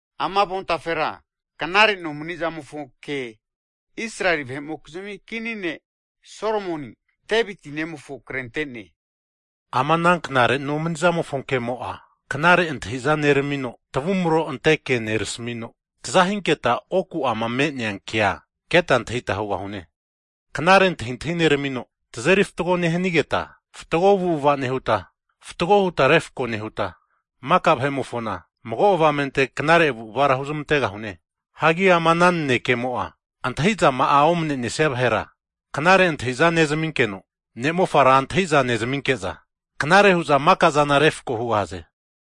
Ama avontafera knare nomanizamofo ke Israeli vahe'mokizmi kini ne' Solomoni, Deviti nemofo krente'ne. Ama knare nomanizamofo ke'mo'a, knare antahi'za neramino, tavumro ante ke nerasmino, taza hinketa oku'ama me'nea kea keta antahita hugahune. Knare antahintahi neramino, tazeri fatgo nehanigeta, fatgo avu'ava nehuta, fatgo huta refko nehuta, maka vahe'mofona mago avamente knare avu'avara huzmantegahune. Hagi ama ana nanekemo'a, antahi'zama'a omane'nesia vahera knare antahintahi nezaminkeno, ne'mofara antahiza nezaminke'za knare hu'za maka zana refko hugahaze.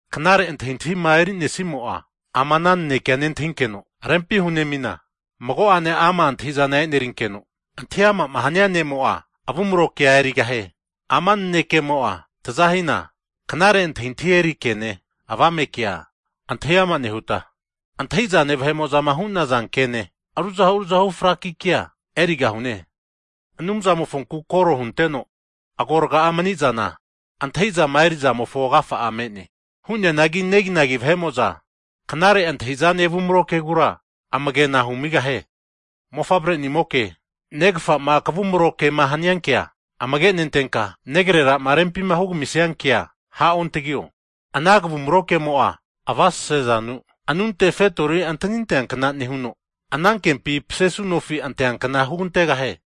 Knare antahintahima eri'nesimo'a, ama nanekea nentahinkeno rempi hunemina, mago'ane ama' antahizana e'nerinkeno, antahi amama hania ne'mo'a, avumro kea erigahie. Ama nanekemo'a zamaza hina, knare antahintahi eri kene, avame kea antahi ama nehuta, antahi'zane vahe'mo'zama hu'naza kene, ruzahu ruzahu fraki kea erigahaze. Anumzamofonku kore hunteno agorga'a manizana, antahizama erizamofo agafa'a me'ne. Hu'neanagi neginagi vahe'mo'za knare antahi'zane avumro kegura amagena humigahie. Mofavre'nimoke, negfama kavumro kema hania kea amage nentenka, negrerama rempima hugamisia kea ha'ontagio. Ana kavumro kemo'a, avasase zanu anunte fetori anteankna nehuno, anankempi pasesu nofi anteankna hugantegahie.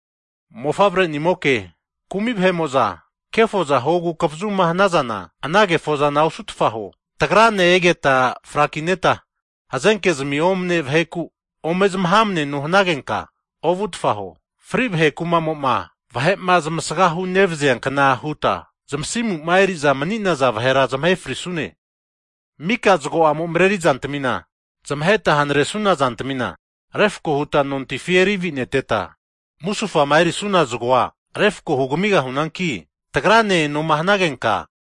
Mofavre'nimoke, kumi vahe'mo'za kefoza huogu kavazuma hanazana, ana kefozana osutfa huo. Tagrane egeta frakineta hazenkezmi omne vaheku ome zmahamneno hnagenka, ovutfa huo. Fri vahe kumamo'ma vahe'ma zamasgahu nevaziankna huta, zamasimuma eri'za mani'naza vahera zmahe frisune. Mika zgo'amo mareri zantamima zmaheta hnaresuna zantamina refko huta nontifi eri antevi'neteta, musufama erisuna zgoa refko hugamigahunanki, tagrane enoma hanagenka,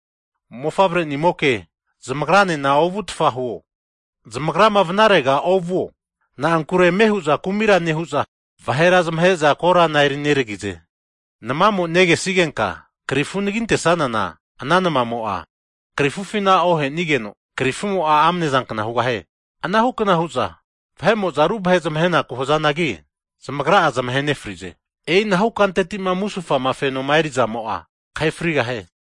mofavre'nimoke, zamagranena ovutfa huo, zamagrama vanarega ovuo. Na'ankure ame hu'za kumira nehu'za, vahera zmahe'za korana eri neragize. Nmamo negesigenka krifu anaginte'sanana, ana namamo'a krifufina ohenigeno, krifumo'a amnezankna hugahie. Anahu kna hu'za, vahe'mo'za ruvahe zmahe'naku hazanagi, zamagra'a zamahe nefrize. E'inahu kanteti'ma musufama fenoma erizamo'a, kahe frigahie.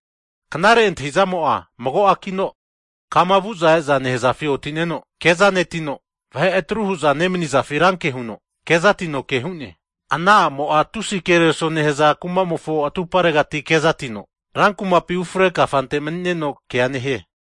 Knare antahintahizamo'a mago a'kna hu'neakino, kama vu'za e'za nehazafi oti'neno kezanetino, vahe atru hu'za nemanizafi ranke huno kezatino ke nehie. Ana a'mo'a tusi kereso nehaza kamofo atuparegati kezatino, rankumapi ufre kafante mni'neno kea nehie.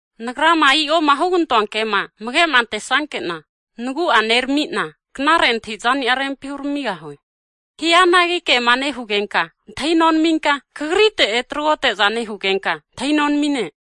Nagrama i'oma hugantoa kema amage'ma antesanke'na, nagu'a neramina, knare antahi'zani'a rempi huramigahue. Hianagi kema nehugenka antahi nonaminka, kagrite etragote'za nehugenka antahi nonamine.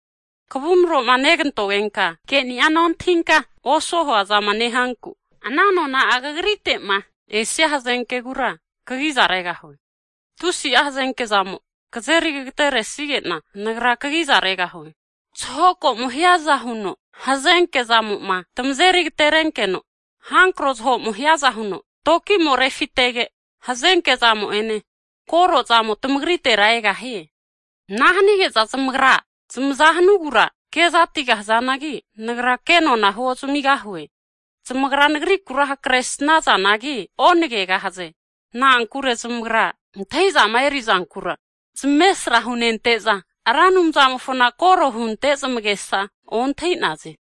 Kavumro'ma negantogenka, keni'a nontahinka, osuo huazama nehanku, ana nona'a kagrite'ma esia hazenkegura, kagiza regahue. Tusi'a hazenke zamo kazeri kagateresige'na, Nagra kagiza regahue. Zahoko'mo hiaza huno hazenke zamo'ma tmazeri agaterenkeno, hankro zaho'mo hiaza huno tinko'mo refitege, hazenke'zamo ene kore'zamo tmagritera egahie. Ana hanige'za zamagra zmazama hanugura kezatigahazanagi, nagra kenona huozamigahue. Zamagra nagrikura hakre snazanagi, onagegahaze. Na'ankure zamagra, antahi'zama erizankura zamesra hunente'za, Ra Anumzamofona kore hunte zamagesa ontahi'naze.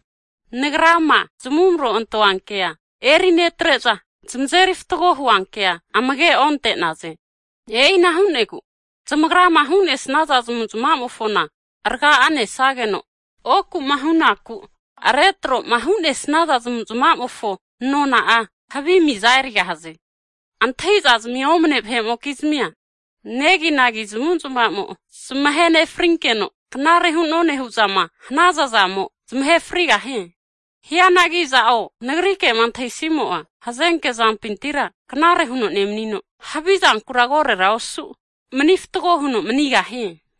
Nagrama zamavumro antoankea erinetre'za, zmazeri fatgo huankea amage onte'naze. E'ina hu'negu zamagrama hu'nesaza zamuzmamofona rga'a nesageno, oku'ma hu'naku retroma hu'nesaza zamavu'zmavamofo nona'a havi miza erigahaze. Antahintahizmi omane vahe'mokizmia, neginagi zmavu'zmavamo zamahe nefrinkeno, knare hu'none hu'zama hanaza zamo, zamahe frigahie. Hianagi aza'o nagri kema antahisimo'a, hazenke e'ori knare huno nemnino, havizankura korora osu mani fru huno manigahie.